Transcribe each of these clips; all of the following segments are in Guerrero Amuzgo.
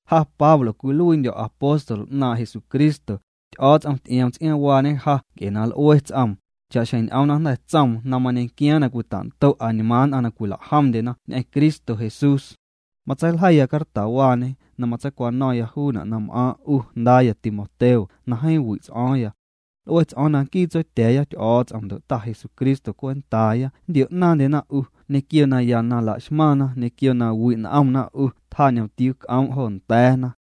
Ja Pablo cwiluiindyo̱ apóstol 'naaⁿ' Jesucristo, Ty'o̱o̱ts'om ty'ioom tsiaaⁿwaañe ja nc'e na l'ue ts'oom, cha'xjeⁿ ñ'oom na jnda̱ tsoom na mañequiaaⁿ na cwita'ndo' añmaaⁿ nn'aⁿ na cwilajomndyena ñ'eⁿ Cristo Jesús. Matseiljeiya cartawaañe na matseicwano̱ⁿya juuna' na m'aaⁿ' 'u jndaaya Timoteo na jeeⁿ wi' ts'o̱o̱ⁿya. L'ue ts'o̱o̱ⁿ na nquii Tsotya̱a̱ya Ty'o̱o̱ts'om ndo' Ta Jesucristo cwentaaya nntio'naaⁿndyena 'u ñequio naya na la'xmaⁿna, ñequio na wi' n'omna 'u tjaañomtiuu c'oom' jo nda̱a̱na.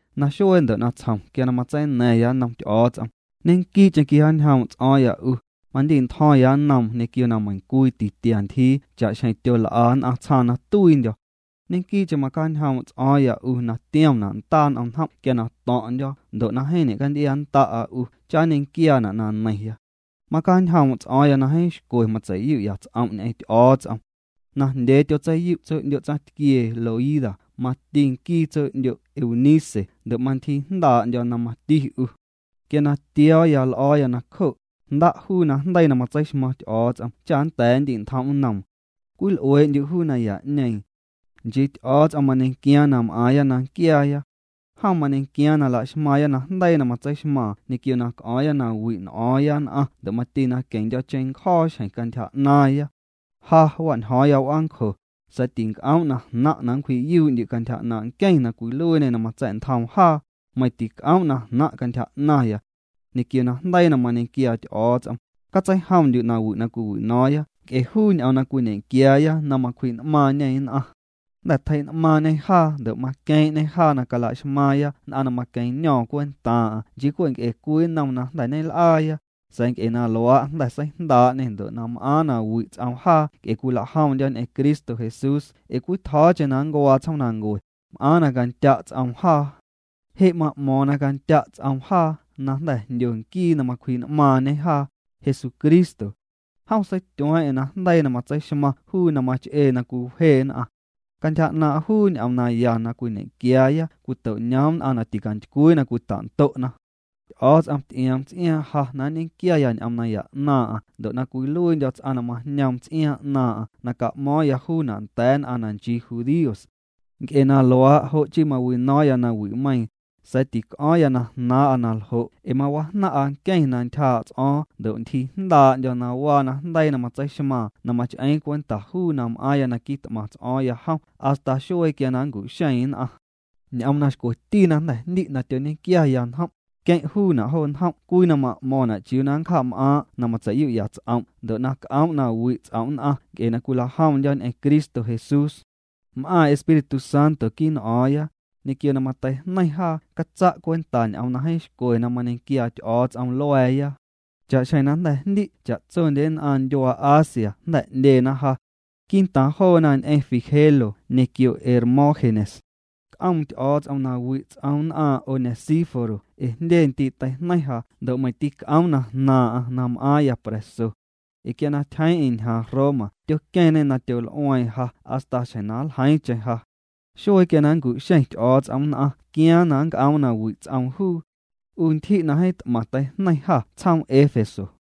Naxuee ndo' natsjom quia na matseina̱ⁿya nnom Ty'o̱o̱ts'om, ñequii'cheⁿ quijaañjoom' ts'o̱o̱ⁿya 'u. Mandi'ntjo̱ⁿya nnoom ñequio na meiⁿcwii titia ntyjii cha'xjeⁿ tyol'a nn'aⁿ tsjaaⁿ na tuiindyo̱. Ñequii'cheⁿ macjaañjoom' ts'o̱o̱ⁿya na tiomna' ndaa n'om njom' quia na to̱ⁿ'ndyo̱ ndo' jeeⁿ ñe'canty'iannda'a 'u cha nñequiaana' na neiⁿya. Macjaañjoom' ts'o̱o̱ⁿ na jeeⁿ xcwe matsei'yu'ya' ts'om' ñ'eⁿ Ty'o̱o̱ts'om. Najndyee tyotseiyu' tso'ndyo' tsaⁿtquiee Loida mati nquii tso'ndyo' Eunice ndo' mantyjiijndaa'ndyo̱ na mati 'u. Quia na tio̱o̱ l'o̱o̱ya nacjo', jnda' juu najndeii na matseixmaⁿ Ty'o̱o̱ts'om cha nnda̱a̱ nndi'ntjom' nnoom. Cwil'uee'ndyu' juu naya'ñeeⁿ. Nchii Ty'o̱o̱ts'om mañequiaaⁿ na m'aaⁿya na nquiaaya. Jom mañequiaaⁿ na laxmaaⁿya najndeii na matseixmaaⁿ ñequio na c'o̱o̱ⁿya na wi' n'o̱o̱ⁿya nn'aⁿ ndo' mati na queⁿndyo̱ cheⁿncjo̱o̱ xjeⁿ cantyja 'naaⁿya. Ja wa'njo̱o̱ⁿ w'aancjo, sa̱a̱ tinc'oom' na jnaⁿ' na nncwji'yuu'ndyu' cantyja 'naaⁿ' nqueⁿ na cwiluiiñê na matsa̱'ntjoom jaa, meiⁿ tinc'oom' na jnaⁿ' cantyja 'naⁿya. Ñequio najndeii na mañequiaa Ty'o̱o̱ts'om, catseijomndyu' nawi' na cwiwino̱o̱ⁿya nc'e juu ñ'oom na cwiñequiaaya na macwji'n'maaⁿñê nn'aⁿ. Jnda̱ tjei'n'maaⁿñê jaa ndo' maqueeⁿ'ñê jaa na calaxmaaⁿya nn'aⁿ na maqueⁿño̱o̱ⁿ cwentaaⁿ'aⁿ nchii cwe' nc'e cwii nnom na jnda̱ ñel'aaya, sa̱a̱ nc'e na luaa' jnda̱ seijndaa'ñê ndo' na m'aaⁿ na wi' ts'oom jaa nc'e cwilajomndyo̱ ñ'eⁿ Cristo Jesús ee cwii tjo̱o̱cheⁿ na ncuaa tsjoomnancue, m'aaⁿ na candya' ts'oom jaa. Je' ma'mo̱o̱ⁿ na candya' ts'oom jaa na jnda̱ jndyo nquii na macwji'n'maaⁿ'ñe jaa, Jesucristo. Jom seityueeⁿ'eⁿ na jndeii na matseixmaⁿ juu na mach'ee na cwiwje nn'aⁿ. Cantyja 'naaⁿ' juu ñ'oom naya na cwiñequiaaya cwito'ñoom nn'aⁿ na ticantycwii na cwita'ndo'na. Ty'o̱o̱ts'om ty'ioom ts'iaaⁿ ja na nñequiaya ñ'oom naya 'naaⁿ'aⁿ ndo' na cwiluiindyo̱ ts'aⁿ na majñoom ts'iaaⁿ 'naaⁿ'aⁿ na ca'mo̱o̱ⁿya juuna' nda̱a̱ nn'aⁿ na nchii judíos. Nc'e na luaa' jo' chii mawino̱o̱ⁿya nawi'meiiⁿ, sa̱a̱ tic'o̱o̱ⁿ na jnaaⁿ'a na ljo' ee mawajnaⁿ'a nqueⁿ na ntyjaa' ts'o̱o̱ⁿ ndo' ntyjiijndaa'ndyo̱ na waa najndeii na matseixmaaⁿ na mach'eeⁿ cwenta juu na m'aaⁿya na quit'maⁿ ts'o̱o̱ⁿya jom hasta xuee quia na nncu'xeeⁿ nn'aⁿ. Ñ'oom na xcweti na jnda̱ jndi' na tyoñequiaya njom', queⁿ' juuna' jo njom' cwii na ma'mo̱ⁿna' chiuu na ncjaam'aaⁿ' na matsei'yu'ya' ts'om' ndo' na c'oom' na wi' ts'om' nn'aⁿ nc'e na cwilajomndyo̱ ñ'eⁿ Cristo Jesús. M'aaⁿ Espíritu Santo quii' n'o̱o̱ⁿya, ñequio na mateijñeiⁿ jaa catsa' cwenta ñ'oom na jeeⁿ xcwe na mañequiaa Ty'o̱o̱ts'om lua̱a̱ya. Cha'xjeⁿ na jnda̱ jndi' cha'tsondye nn'aⁿ ndyuaa Asia jnda̱ 'ndyena ja. Quii'ntaaⁿ joona ñ'eⁿ Figelo ñequio Hermógenes. C'oom Ty'o̱o̱ts'om nawi' ts'oom nn'aaⁿ' Onesíforo ee jndye ndii' teijneiⁿ ja ndo' meiⁿ tîc'oom na jnaaⁿ'aⁿ na m'aaⁿya pra̱so. Ee quia na tyjeeⁿ'eⁿ ñjaaⁿ Roma tyoqueⁿñê na tyol'ueeⁿ ja hasta xjeⁿ na nljeiiⁿcheⁿ ja. Xuee quia na nncu'xeⁿ Ty'o̱o̱ts'om nn'aⁿ quiaaⁿ na nnc'oom na wi' ts'oom juu. 'U ntyji' na jeeⁿ t'maⁿ teijneiⁿ jâ tsjoom Éfeso.